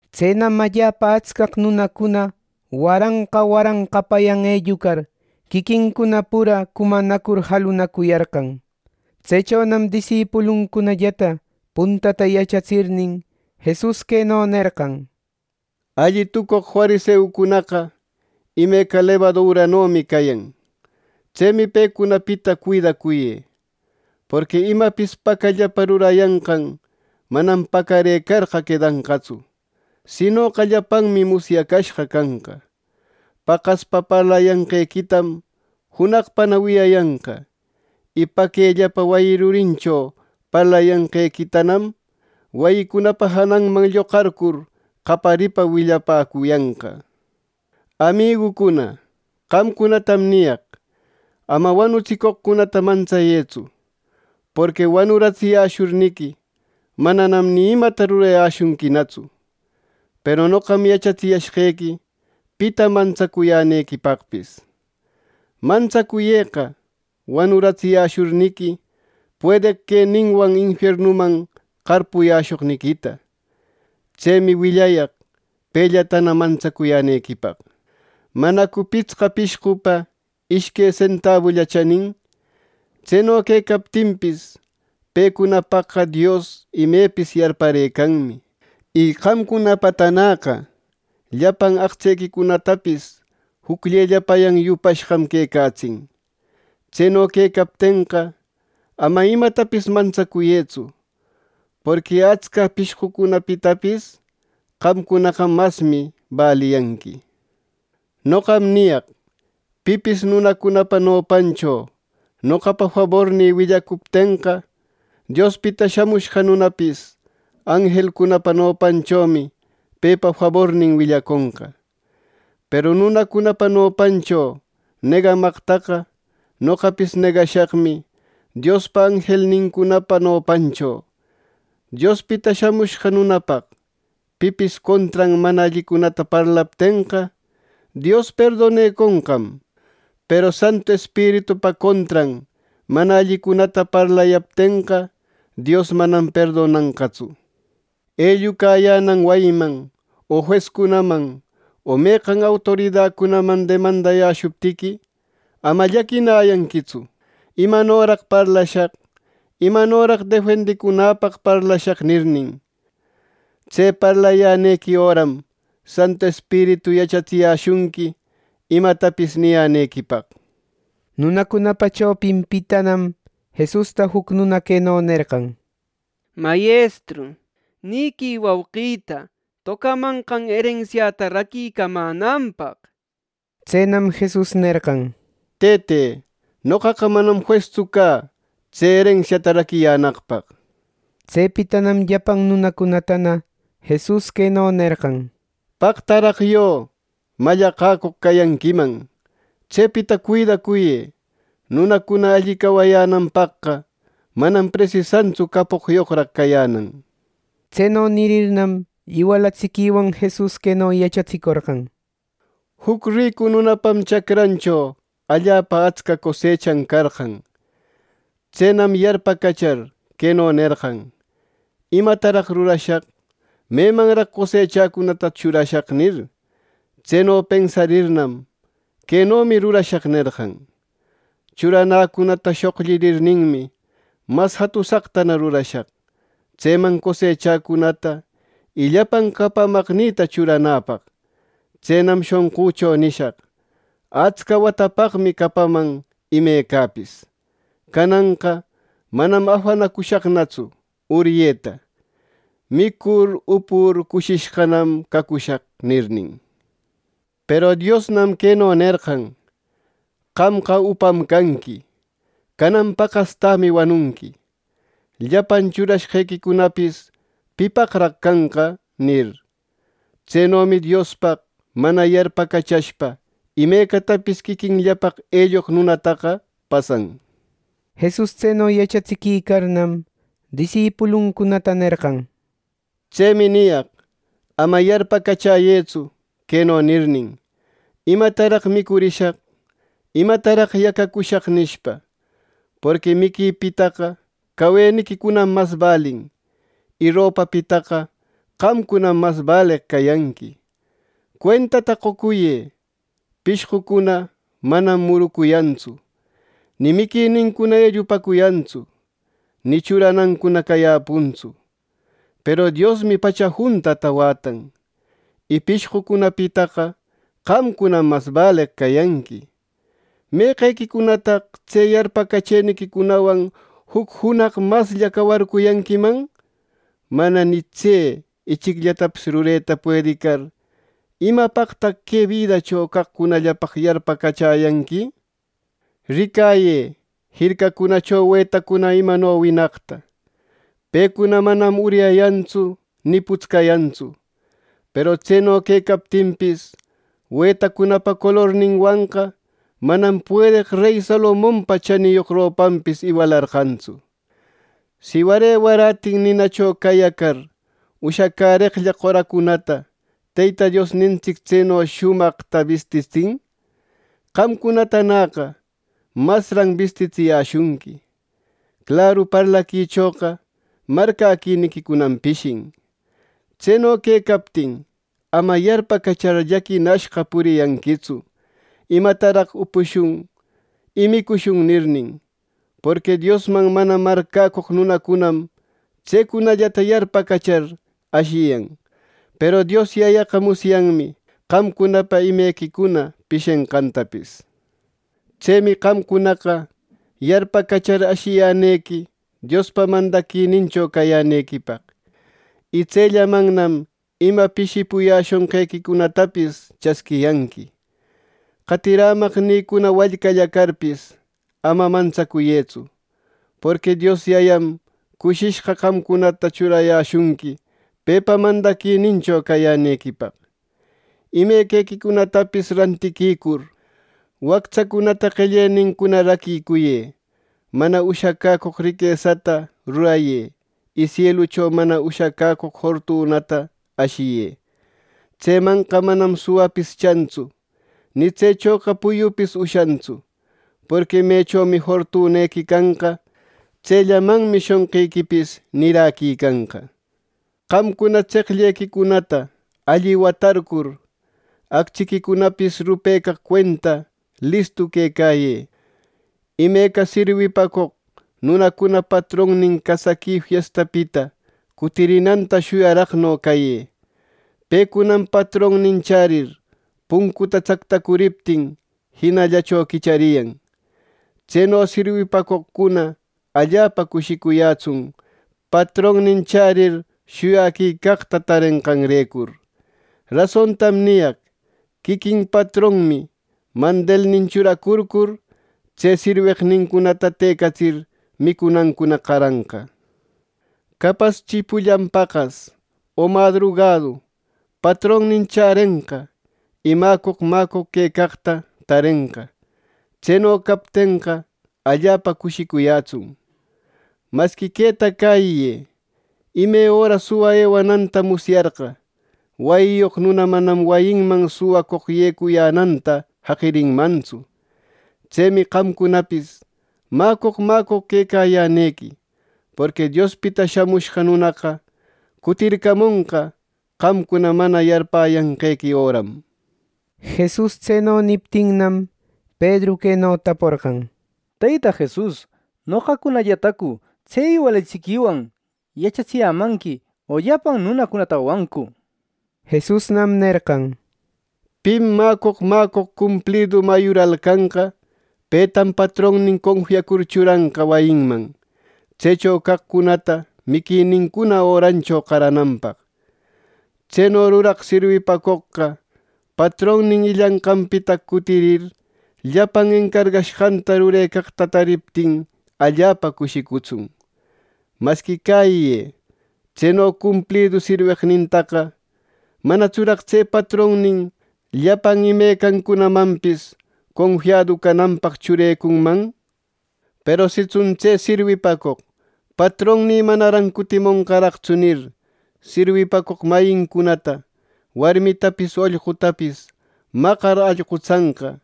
Tsenam allapa atscaq nunacuna waranqa waranqapayan ellucar, quiquincuna pura cumanacur jalunacuyarqan. Tsechonam disipuluncunallata puntata yachatsirnin, Jesus queno nerqan, “Alli tucoq fariseucunaqa imeca lebaduranomi cayan. Tsemi pecunapita cuidacuyë. Porqui imapis pacallapa rurayanqan manam pacarëcarqa quedanqatsu; sinoqa llapanmi musyacashqa canqa. Paqaspa parlayanqequitam junaqpana wiyayanqa; y paquellapa wayi rurincho parlayanqequitanam, wayicunapa jananman lloqarcur qayaripa willapäcuyanqa. “Amigücuna, qamcunatam niyaq: Ama wanutsicoqcunata mantsayëtsu, porqui wanuratsiyäshurniqui, mananam ni imata rurayäshunquinatsu. Peru noqam yachatsiyashqequi pita mantsayänequipaqpis: Mantsacuyëqa wanuratsiyäshurniqui, puedeq queninwan infiernuman qarpuyäshoqniquita. Tsemi willayaq pellatana mantsacuyänequipaq. “¿Manacu pitsqa pishqupa ishque sentabulla chanin! Tseno quecaptinpis, pecunapaqqa Dios imepis yarparëcanmi. Y qamcunapatanäqa llapan aqtsequicunatapis jucllellapayan yupashqam quecatsin. Tseno quecaptenqa, ama imatapis mantsacuyëtsu. Porqui atsca pishqocunapitapis qamcunaqa masmi baliyanqui. “Noqam niyaq: Pipis nunacunapa nopancho noqapa fabornï willacuptenqa, Diospita Shamushqa Nunapis anjelcunapa nopanchomi pepa fabornin willaconqa. Peru nunacunapa nopancho negamaqtaqa, noqapis negashaqmi Diospa anjelnincunapa nopancho. Diospita Shamushqa Nunapaq, pipis contran mana allicunata parlaptenqa, Dios perdoneconqam; peru Santu Espiritupa contran mana allicunata parlayaptenqa, Dios manam perdonanqatsu. “Ellucayänan wayiman o juescunaman o meqan autoridacunaman demandayäshuptiqui, ama llaquinayanquitsu ‘¿Imanoraq parlashaq? ¿Imanoraq defendicunäpaq parlashaq?’ nirnin. Tse parlayänequi öram Santu Espiritu yachatsiyäshunqui imatapis niyänequipaq.” Nunacunapa chopinpitanam Jesusta juc nuna queno nerqan: —Mayestru, niquï wauqïta tocamanqan erensiata raquimänanpaq. Tsenam Jesus nerqan: —Tëte, noqaqa manam juestsu cä tse erensiata raquiyänaqpaq. Tsepitanam llapan nunacunatana Jesus queno nerqan: —¡Paqtaraq yö! Mallaqäcoq cayanquiman, tsepita cuidacuyë. Nunacuna alli cawayänanpaqqa manam presisantsu capoqyoqraq cayänan —nir. Tseno nirirnam iwalatsiquiwan Jesus queno yachatsicorqan, “Juc ricu nunapam chacrancho allapa atsca cosechan carqan. Tsenam yarpacachar, queno nerqan, ‘¿Imataraq rurashaq? ¿Memanraq cosechäcunata churashaq?’ nir. Tseno pensarirnam ‘Quenomi rurashaq’ nerqan. ‘Churanäcunata shoqllirirninmi, mas jatusaqtana rurashaq. Tseman cosechäcunata y llapan capamaqnïta churanäpaq.’ Tsenam shonqücho nishaq, ‘Atsca watapaqmi capaman imecapis. Cananqa manam afanacushaqnatsu uryeta. Micucur upucur, cushishqanam cacushaq’ nirnin. “Peru Diosnam queno nerqan, ‘¡Qamqa upam canqui! ¡Canan paqastämi wanunqui! ¿Llapan churashqequicunapis pipaqraq canqa?’ nir. “Tsenomi Diospaq mana yarpacachashpa imecatapis quiquinllapaq elloq nunataqa pasan.” Jesus tseno yachatsiquicarnam, disipuluncunata nerqan “Tsemi niyaq: Ama yarpacachäyëtsu, queno nirnin ‘¿Imataraq micurishaq? ¿Imataraq yacacushaq?’ nishpa. Porqui miquipitaqa caweniquicunam mas balin, y ropapitaqa qamcunam mas baleq cayanqui. Cuentata qocuyë. Pishqucuna manam murucuyantsu, ni miquicunata ellupäcuyantsu, ni churanancuna cayäpuntsu. Peru Diosmi pacha juntata wätan, y pishqucunapitaqa qamcunam mas baleq cayanqui. ¿Meqequicunataq tse yarpacachëniquicunawan juc junaq maslla cawarcuyanquiman! Mana ni tse ichicllatapis rureta puedicar, ¿imapaqtaq que bidacho caqcunallapaq yarpacachäyanqui! “Ricayë jircacunacho wetacuna imano winaqta. Pecuna manam uryayantsu ni putscayantsu. Peru tseno quecaptinpis, wetacunapa colorninwanqa manam puedeq rey Salomonpa chaniyoq ropanpis iwalarqantsu. Si ware waratin ninacho cayacar ushacäreqlla qoracunata Teyta Diosnintsic tseno shumaq bistitsin, qamcunatanäqa masran bistitsiyäshunqui. ¡Claru parlaquichoqa marcäquiniquicunam pishin! Tseno quecaptin, ama yarpacachar llaquinashqa puriyanquitsu ‘¡Imataraq upushun y micushun!’ nirnin. Porqui Diosman mana marcäcoq nunacunam tsecunallata yarpacachar, ashiyan. Peru Dios Yayaqa musyanmi qamcunapa imequicuna pishenqantapis. Tsemi qamcunaqa yarpacachar, ashiyänequi Diospa mandaquinincho cayänequipaq, y tsellamannam ima pishipuyäshonqequicunatapis chasquiyanqui. “Qatirämaqnïcuna, wallcalla carpis, ama mantsacuyëtsu, porqui Dios Yayam cushishqa qamcunata churayäshunqui pepa mandaquinincho cayänequipaq. Imequicunatapis rantiquicur, wactsacunata qellenincuna raquicuyë. Mana ushacäcoq riquesata rurayë, y sielucho mana ushacaq fortunata ashiyë. Tsemanqa manam suwapis chantsu, ni tsechoqa puyupis ushantsu. Porqui mechomi fortunequi canqa, tsellamanmi shonqiquipis niräquicanqa. “Qamcuna tseqllequicunata alli watarcur, actsiquicunapis rupecaq cuenta listu quecayë. Imeca sirwipacoq nunacuna patronnin casaqui fiestapita cutirinanta shuyaraqno cayë. Pecunam patronnin chärir, puncuta tsactacuriptin, jinallacho quichariyan. Tseno sirwipacoqcuna allapa cushicuyätsun, patronnin chärir, shuyaquicaqta tarenqanrecur. Rasontam niyaq: Quiquin patronmi mandilnin churacurcur, tse sirweqnincunata tëcatsir, micunancuna qaranqa. Capaschi pullan paqas o madrugadu patronnin chärenqa, y mäcoq mäcoq quecaqta tarenqa. Tseno captenqa, allapa cushicuyätsun. Masqui queta cäyiyë: Ime öra suwa ewananta musyarqa, wayiyoq nuna manam wayinman suwacoq yecuyänanta jaqirinmantsu. Tsemi qamcunapis mäcoq, mäcoq quecayänequi; porqui Diospita Shamushqa Nunaqa cutircamonqa qamcuna mana yarpäyanqequi öram.” Jesus tseno niptinnam, Pedru queno taporqan: —Teyta Jesus, ¿noqacunallatacu tse iwalatsiquiwan yachatsiyämanqui, o llapan nunacunatawancu? Jesusnam nerqan: —Pim mäcoq, mäcoq, cumplidu mayural canqa, petam patronnin confiacur churanqa wayinman, tsecho caqcunata miquinincuna örancho qarananpaq. Tseno ruraq sirwipacoqqa patronnin illanqanpita cutirir, llapan encargashqanta rurecaqta taririptin allapa cushicutsun. Masqui cäyiyë: Tseno cumplidu sirweqnintaqa ¿manatsuraq tse patronnin llapan imecancunamanpis confiadu cananpaq churecunman! Peru sitsun tse sirwipacoq ‘Patronnï manaran cutimonqaraqtsu’ nir, sirwipacoq mayincunata warmitapis ollqutapis maqar allqutsanqa,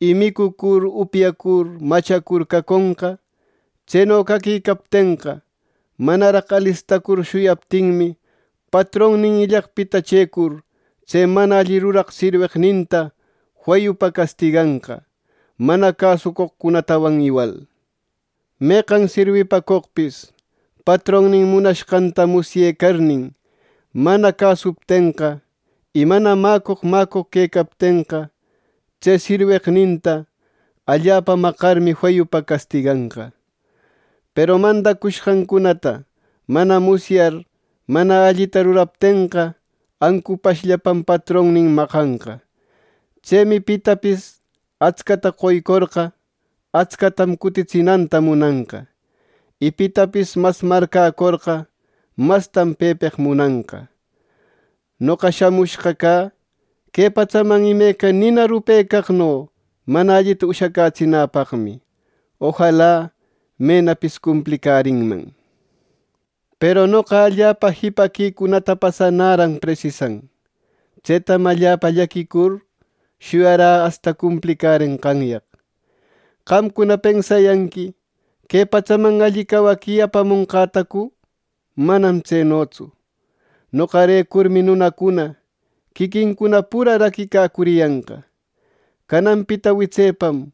y micucur upyacur machacur caconqa; tseno caquicaptenqa, manaraq alistacur shuyaptinmi, patronnin illaqpita chëcur, tse mana alli ruraq sirweqninta feyupa castiganqa, mana cäsucoqcunatawan iwal. “Meqan sirwipacoqpis patronnin munashqanta musyecarnin, mana cäsuptenqa, y mana mäcoq mäcoq quecaptenqa, tse sirweqninta allapa maqarmi feyupa castiganqa. Peru mandacushqancunata mana musyar mana allita ruraptenqa, ancupashllapam patronnin maqanqa. Tsemi pitapis atscata qoycorqa, atscatam cutitsinanta munanqa; y pitapis mas marcäcorqa, mastam pepeq munanqa. “Noqa shamushqa cä que patsaman imeca nina rupecaqno mana allita ushacätsinäpaqmi. Ojala menapis cumplicärinman. Peru noqa allapa jipaquicunata pasanäran presisan. Tsetam allapa llaquicur, shuyarä asta cumplicärenqanyaq. ¿Qamcuna pensayanqui que patsaman alli cawaqui apamonqätacu? Manam tsenotsu. Noqarecurmi nunacuna quiquincuna pura raquicacuriyanqa. Cananpita witsepam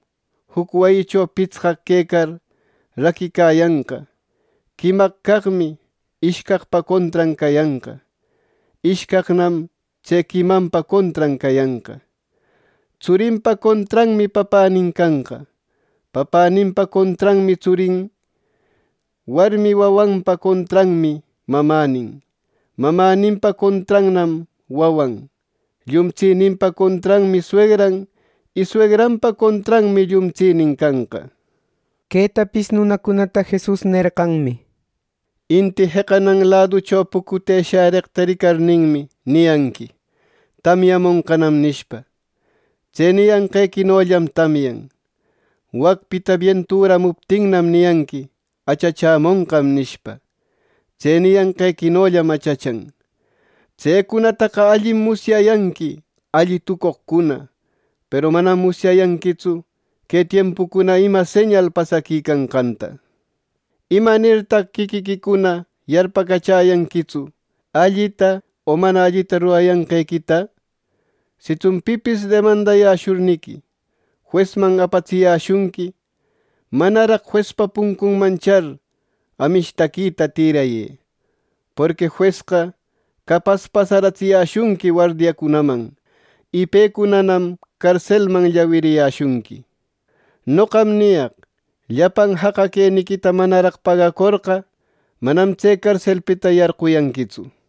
juc wayicho pitsqaq quecar, raquicayanqa. Quimaq caqmi ishcaqpa contran cayanqa. Ishcaqnam tse quimanpa contran cayanqa. Tsurinpa contranmi papänin canqa, papäninpa contrannam tsurin, warmi wawanpa contranmi mamänin, mamäninpa contrannam wawan, llumtsininpa contranmi suegran y suegranpa contranmi llumtsinin canqa.” Quetapis nunacunata Jesus nerqanmi: “Inti jeqanan laducho pucute shäreqta ricarninmi, niyanqui: ‘Tamyamonqanam’ nishpa. Tse niyanqequinollam tamyan. Wacpita bienturamuptinnam, niyanqui ‘Achachämonqam’ nishpa. Tse niyanqequinollam achachan. ¡Tsecunataqa allim musyayanqui, alli tucoqcuna! ¡Peru manam musyayanquitsu que tiempucuna ima señal pasaquicanqanta! “¿Imanirtaq quiquiquicuna yarpacachäyanquitsu allita o mana allita rurayanqequita! Sitsun pipis demandashurniqui, juesman apatsiyäshunqui, manaraq juespa puncunman char amishtaquita tïrayë. Porqui juesqa capas pasaratsiyäshunqui wardiacunaman, y pecunanam carselman llawiriyäshunqui. Noqam niyaq: Llapan jaqa queniquita manaraq pagacorqa, manam tse carselpita yarquyanquitsu” nir.